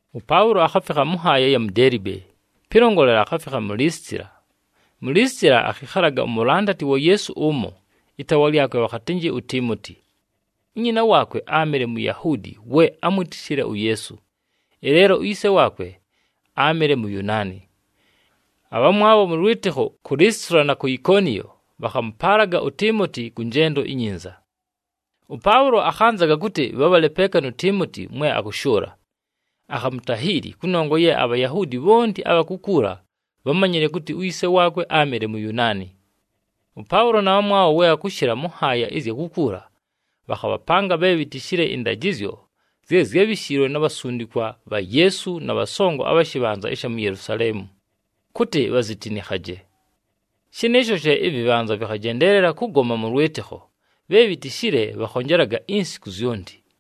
ɄPaʉlo akhafikha mʉ nhaaya ɨya mu Deelibe, pɨlongolela akhafikha mu Lisitila. Mu Lisitila akhɨkhalaga umulandati wa Yeesu ʉmo, ɨtaawa lyakwe bhakhatɨnjɨ uTiimoti. Unyina waakwe áamɨle Muyahuudi we ámwitishile uYeesu, ɨleelo uyise waakwe áamɨle Muyunaani. Abhamwabho mʉ lwɨtɨkho ku Lisitila na ku Ikoniyo bhakhamʉpaalaga uTiimoti kʉ njendo inyinza. ɄPaʉlo akhanzaga kʉtɨ bhabhale peeka nu Tiimoti mwe akʉshʉʉla, akhamutahiili, kʉnongwa ye aBhayahuudi bhonti abha kukuula bhámanyile kʉtɨ uyise waakwe áamɨle Muyunaani. ɄPaʉlo na bhamwabho we bhakʉshɨla mʉ nhaaya ɨzya kukuula, bhakhabhapanga bhe bhitishile ɨndajɨzyo zye zyábhishiilwe na bhasundikwa bha Yeesu na bhasongo abha shɨbhanza ɨsha mu Yelusaleemu, kʉtɨ bhazitinikhaje. Shɨnɨɨsho she ɨvɨbhanza vɨkhajendeelela kʉgoma mʉ lwɨtɨkho, bhe bhitishile bhakhonjelaga insiku zyonti.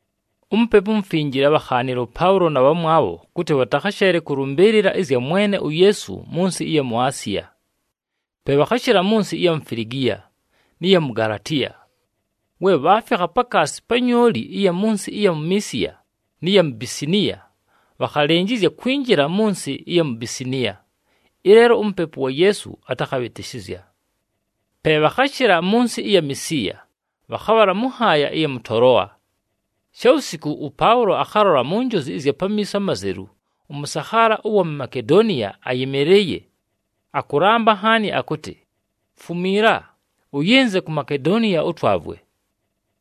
UMupepu uMufinjile ábhakhaanile ʉPaʉlo na bhamwabho kʉtɨ bhatakhasheele kʉlʉmbɨɨlɨla ɨzya Mwene uYeesu mʉ nsɨ ɨya mu Asiya. Pe bhakhashɨla mʉ nsɨ ɨya mu Filigiya, nɨ ya mu Galatiya. We bhaafikha pakaasi pa nyooli ɨya mʉ nsɨ ɨya Misiya nɨ ya Bisiniya, bhakhalɨnjɨzya kwinjila mʉ nsɨ ɨya mu Bisiniya, ɨleelo uMupepu wa Yeesu atakhabhɨtɨshɨzya. Pe bhakhashɨla mʉ nsɨ ɨya Misiya, bhakhabhala mʉ nhaaya ɨya mʉ Toloa. Shawusiku ʉPaʉlo akhalola mu njozi ɨzya pamiiso amazelu ʉmʉsakhaala ʉwa mu Makedoniya ayɨmɨlɨɨye, akʉlamba nhaani akʉtɨ, “Fumiila, ʉyɨnze ku Makedoniya ʉtwavwe.”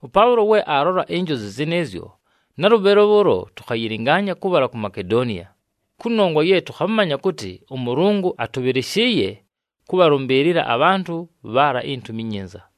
ɄPaʉlo we aalola injozi zɨnɨɨzyo, nalʉbhɨlo bhʉʉlo tʉkhayɨlɨngaanya kʉbhala ku Makedoniya, kʉnongwa ye tʉkhamanya kʉtɨ ʉMʉlʉngʉ atʉbhɨlɨshɨɨye kʉbhalʉmbɨɨlɨla abhantʉ bhaala iNtumi iNyinza.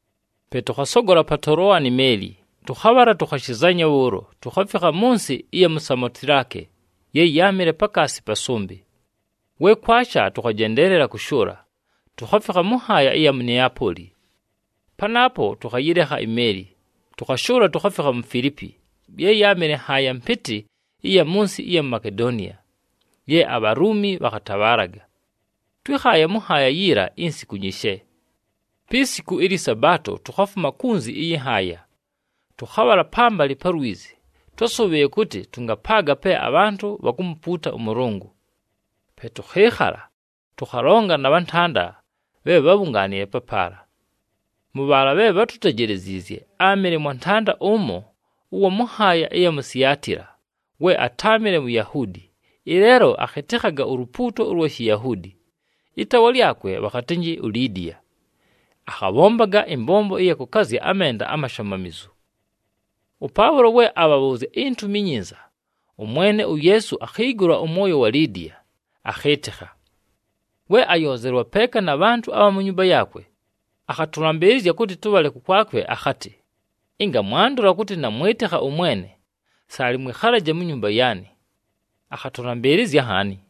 Pe tʉkhasogola pa Toloa ni meeli, tʉkhabhala tukhashizanya bhʉʉlo tukhafikha mʉ nsɨ ɨya mu Samotilake ye yáamɨle pakaasi pa sʉmbɨ. We kwasha, tʉkhajendeelela kʉshʉʉla, tukhafikha mʉ nhaaya ɨya mu Neapooli. Panaapo, tʉkhayɨlekha imeeli, tʉkhashʉʉla tukhafikha mu Filiipi, ye yáamɨle nhaaya mpɨtɨ ɨya mʉ nsɨ ɨya Makedoniya, ye aBhaluumi bhakhatabhaalaga. Twɨ́khaaye mʉ nhaaya yiila insiku nyishe. Pi siku ɨlyɨ Sabaato tukhafuma kunzi ɨyɨ nhaaya, tʉkhabhala pambalɨ pa lwizi, twásʉbhɨɨye kʉtɨ tʉngapaaga pe abhantʉ bhakumupuuta ʉMʉlʉngʉ. Pe tʉkhɨɨkhala, tʉkhalonga na bhantanda bhe bhábhungaanile papaala. Mʉ bhaala bhe bhátutejeleziizye, áamɨle mwantanda ʉmo ʉwa mʉ nhaaya ɨya mu Siatila we atáamɨle Muyahuudi, ɨleelo akhɨtɨkhaga ulupuuto ʉlwa Shiyahuudi. Ɨtaawa lyakwe bhakhatɨnjɨ uLidiya, akhabhombaga ɨmbombo ɨya kʉkazya amenda amashamamizu. ɄPaʉlo we abhabhʉʉzya iNtumi iNyinza, ʉMwene uYeesu akhiigula ʉmwoyo wa Lidiya, akhɨɨtɨkha. We ayoozelwa peeka na bhantʉ abha mu nyumba yaakwe, akhatʉlambɨɨlɨzya kʉtɨ tʉbhale kʉkwakwe akhatɨ, “Ɨnga mwandola kʉtɨ namwɨtɨkha ʉMwene, saalɨ mwɨkhalaje mu nyumba yaanɨ.” Akhatʉlambɨɨlɨzya nhaani.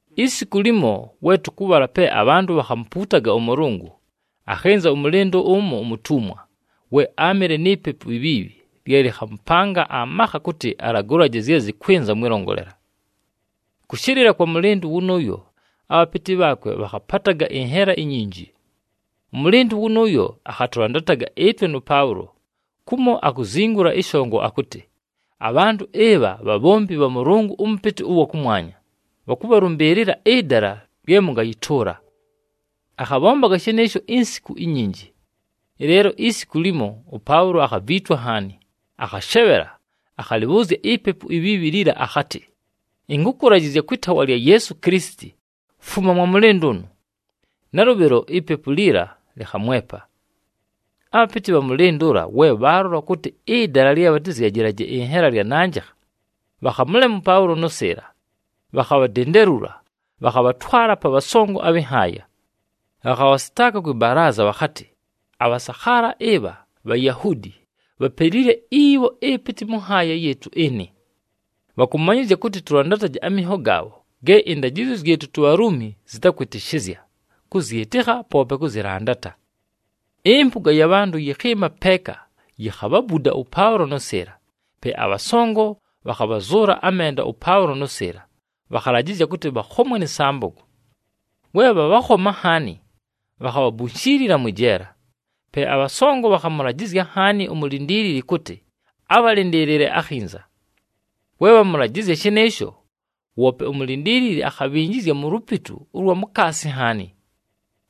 Isiku limo, we tʉkʉbhala pe abhantʉ bhakhamupuutaga ʉMʉlʉngʉ, akhɨnza ʉmʉlɨndʉ ʉmo umutumwa, we áamɨle ni pepu ibhiibhi lye lɨkhamʉpanga amakha kʉtɨ alagʉlaje zye zɨkwɨnza mwɨlongolela. Kʉshɨlɨla kwa mʉlɨndʉ wʉnʉʉyo abhapɨtɨ bhaakwe bhakhapataga ɨnhela inyinji. Ʉmʉlɨndʉ wʉnʉʉyo akhatʉlandataga ɨtwe nʉ Paʉlo, kumo akuzingula ɨshongo akʉtɨ, “Abhantʉ ɨbha bhabhombi bha Mʉlʉngʉ ʉMʉpɨtɨ ʉwa kʉmwanya, bhakʉbhalʉmbɨɨlɨla ɨdala lye mʉngayɨtʉʉla!” Akhabhombaga shɨnɨɨsho insiku inyinji. Ɨleelo isiku limo, ʉPaʉlo akhaviitwa nhaani, akhashebhela, akhalɨbhʉʉzya ipepu ibhiibhi liila akhatɨ, “Ɨnkʉkʉlajɨzya kwɨ taawa lya Yeesu Kilisiti, fuma mwa mʉlɨndʉ ʉnʉ!” Nalʉbhɨlo ipepu liila lɨkhamwepa. Abhapɨtɨ bha mʉlɨndʉ ʉla, we bhaalola kʉtɨ ɨdala lye bhatɨzyajɨlaje ɨnhela lyananjɨkha, bhakhamʉlema ʉPaʉlo nʉ Sɨɨla, bhakhabhadendelula, bhakhabhatwala pa bhasongo abhɨ nhaaya. Bhakhabhasɨtaaka kwɨ balaaza bhakhatɨ, “Abhasakhaala ɨbha Bhayahuudi, bhapelile ibho ɨpɨtɨ mʉ nhaaya yɨɨtʉ ɨnɨ. Bhakʉmanyɨzya kʉtɨ tʉlandataje aminho gaabho ge ɨndajɨzyo zyɨtʉ tuBhaluumi zɨtakwɨtɨshɨzya kʉzyɨtɨkha, poope kʉzɨlandata.” Ɨmpʉga ya bhantʉ yɨkhɨɨma peeka yikhabhabuda ʉPaʉlo nʉ Sɨɨla. Pe abhasongo bhakhabhazʉʉla amenda ʉPaʉlo nʉ Sɨɨla, bhakhalajɨzya kʉtɨ bhakhomwe nɨ sambogo. We bhabhakhoma nhaani, bhakhabhabunshiilila mwɨ jeela. Pe abhasongo bhakhamʉlajɨzya nhaani umulindiilili kʉtɨ abhalɨndɨɨlɨle akhinza. We bhamʉlajɨzya shɨnɨɨsho, woope umulindiilili akhabhinjizya mu lupitu ʉlwa mukaasi nhaani,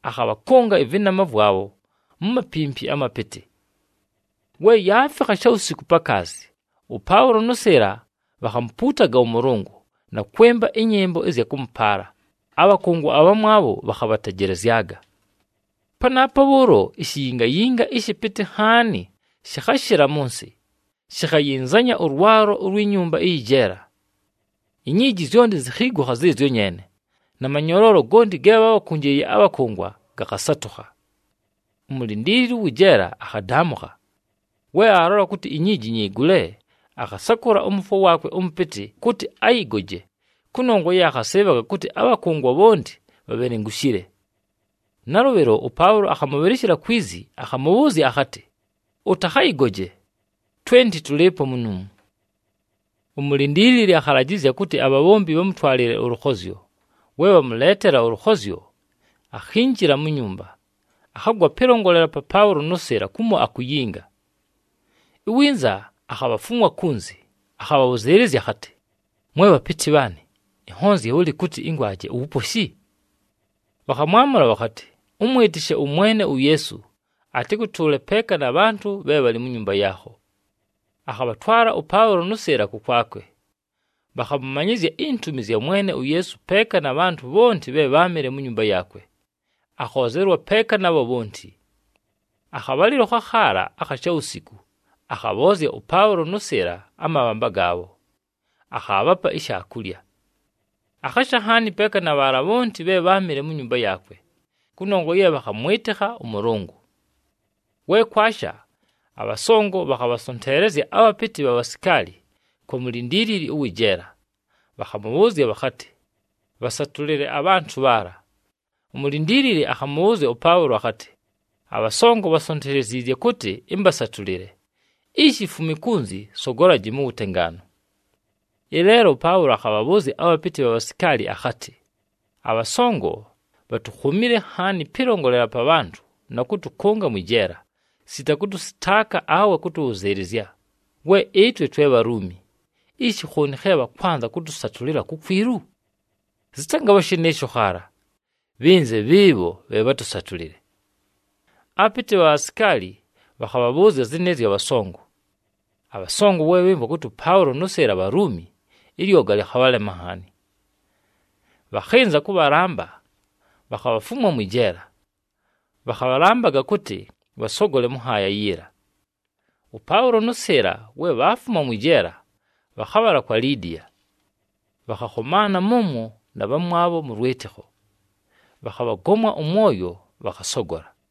akhabhakʉnga ɨvɨnama vwabho mu mapimpi amapɨtɨ. We yaafikha shawusiku pakaasi, ʉPaʉlo nʉ Sɨɨla bhakhamupuutaga ʉMʉlʉngʉ, na kwɨmba ɨnyɨmbo ɨzya kʉmʉpaala, abhakʉngwa abhamwabho bhakhabhatejelezyaga. Panaapo bhʉʉlo ishiyingayinga ɨshɨpɨtɨ nhaani shɨkhashɨla mʉ nsɨ, shikhayinzanya ʉlwalo ulwi nyumba ɨyɨ jeela. Inyiiji zyonti zikhiigukha zɨɨzyo nyeene, na manyoloolo gonti ge bhábhakʉnjɨɨye abhakʉngwa gakhasatʉkha. Umulindiilili ʉwɨ jeela akhadaamʉkha. We aalola kʉtɨ inyiiji nyigule, akhasakʉla ʉmʉfwo waakwe ʉmʉpɨtɨ kʉtɨ ayɨgoje kʉnongwa ye akhasɨɨbhaga kʉtɨ abhakʉngwa bhonti bhabhelengushile. Nalʉbhɨlo ʉPaʉlo akhamʉbhɨlɨshɨla kwi zi akhamʉbhʉʉzya akhatɨ, “Ʉtakhayɨgoje! Twenti tʉlɨɨpo munuumu.” Umulindiilili akhalajɨzya kʉtɨ abhabhombi bhamʉtwalɨle ʉlʉkhozyo. We bhamʉleetela ʉlʉkhozyo, akhinjila mu nyumba, akhagwa pɨlongolela pa Paʉlo nʉ Sɨɨla kumo akuyinga. Iwinza akhabhafumwa kunzi, akhabhabhʉzɨɨlɨzya akhatɨ, “Mwe bhapɨtɨ bhaanɨ, ɨnhonzye bhʉlɨ kʉtɨ ɨngwaje uwuposhi?” Bhakhamwamʉla bhakhatɨ, “Ʉmwɨtɨshe ʉMwene uYeesu, atɨkʉtʉʉle peeka na bhantʉ bhe bhalɨ mu nyumba yaakho.” Akhabhatwala ʉPaʉlo nʉ Sɨɨla kʉkwakwe, bhakhamʉmanyɨzya intumi zya Mwene uYeesu peeka na bhantʉ bhonti bhe bháamɨle mu nyumba yaakwe, akhoozelwa peeka nabho bhonti. Akhabhalɨlo khakhaala akha shawusiku, akhabhoozya ʉPaʉlo nʉ Sɨɨla amabhamba gaabho, akhaabhapa ishaakulya. Akhasha nhaani peeka na bhaala bhonti bhe bháamɨle mu nyumba yaakwe, kʉnongwa ye bhakhamwɨtɨkha ʉMʉlʉngʉ. We kwasha, abhasongo bhakhabhasonteelezya abhapɨtɨ bha bhasikaali kwa mulindiilili ʉwɨ jeela, bhakhamʉbhʉʉzya bhakhatɨ, “Bhasatʉlɨle abhantʉ bhaala.” Umulindiilili akhamʉbhʉʉzya ʉPaʉlo akhatɨ, “Abhasongo bhansonteleziizye kʉtɨ ɨmbasatʉlɨle, ishi fumi kunzi, sogolaji mu wutengaanu.” Ɨleelo ʉPaʉlo akhabhabhʉʉzya abhapɨtɨ bha bhasikaali akhatɨ, “Abhasongo bhatukhomile nhaani pɨlongolela pa bhantʉ na kʉtʉkʉnga mwɨ jeela sita kʉtʉsɨtaaka awe kʉtʉbhʉzɨɨlɨzya, we ɨtwe twe Bhaluumi. Ishi khooni khe bhakwanza kʉtʉsatʉlɨla kukwilu? Zɨtangabha shɨnɨɨsho khaala! Bhɨnze bhɨɨbho bhe bhatʉsatʉlɨle.” Abhapɨtɨ bha bhasikaali bhakhabhabhʉʉzya zɨnɨɨzyo abhasongo. Abhasongo we bhɨmvwa kʉtɨ ʉPaʉlo nʉ Sɨɨla Bhaluumi, ɨlyoga lɨkhabhalema nhaani. Bhakhɨnza kʉbhalamba, bhakhabhafumwa mwɨ jeela, bhakhabhalambaga kʉtɨ bhasogole mʉ nhaaya yiila. ɄPaʉlo nʉ Sɨɨla, we bhaafuma mwɨ jeela, bhakhabhala kwa Lidiya. Bhakhakhomaana mʉmwo na bhamwabho mʉ lwɨtɨkho, bhakhabhagomwa ʉmwoyo, bhakhasogola.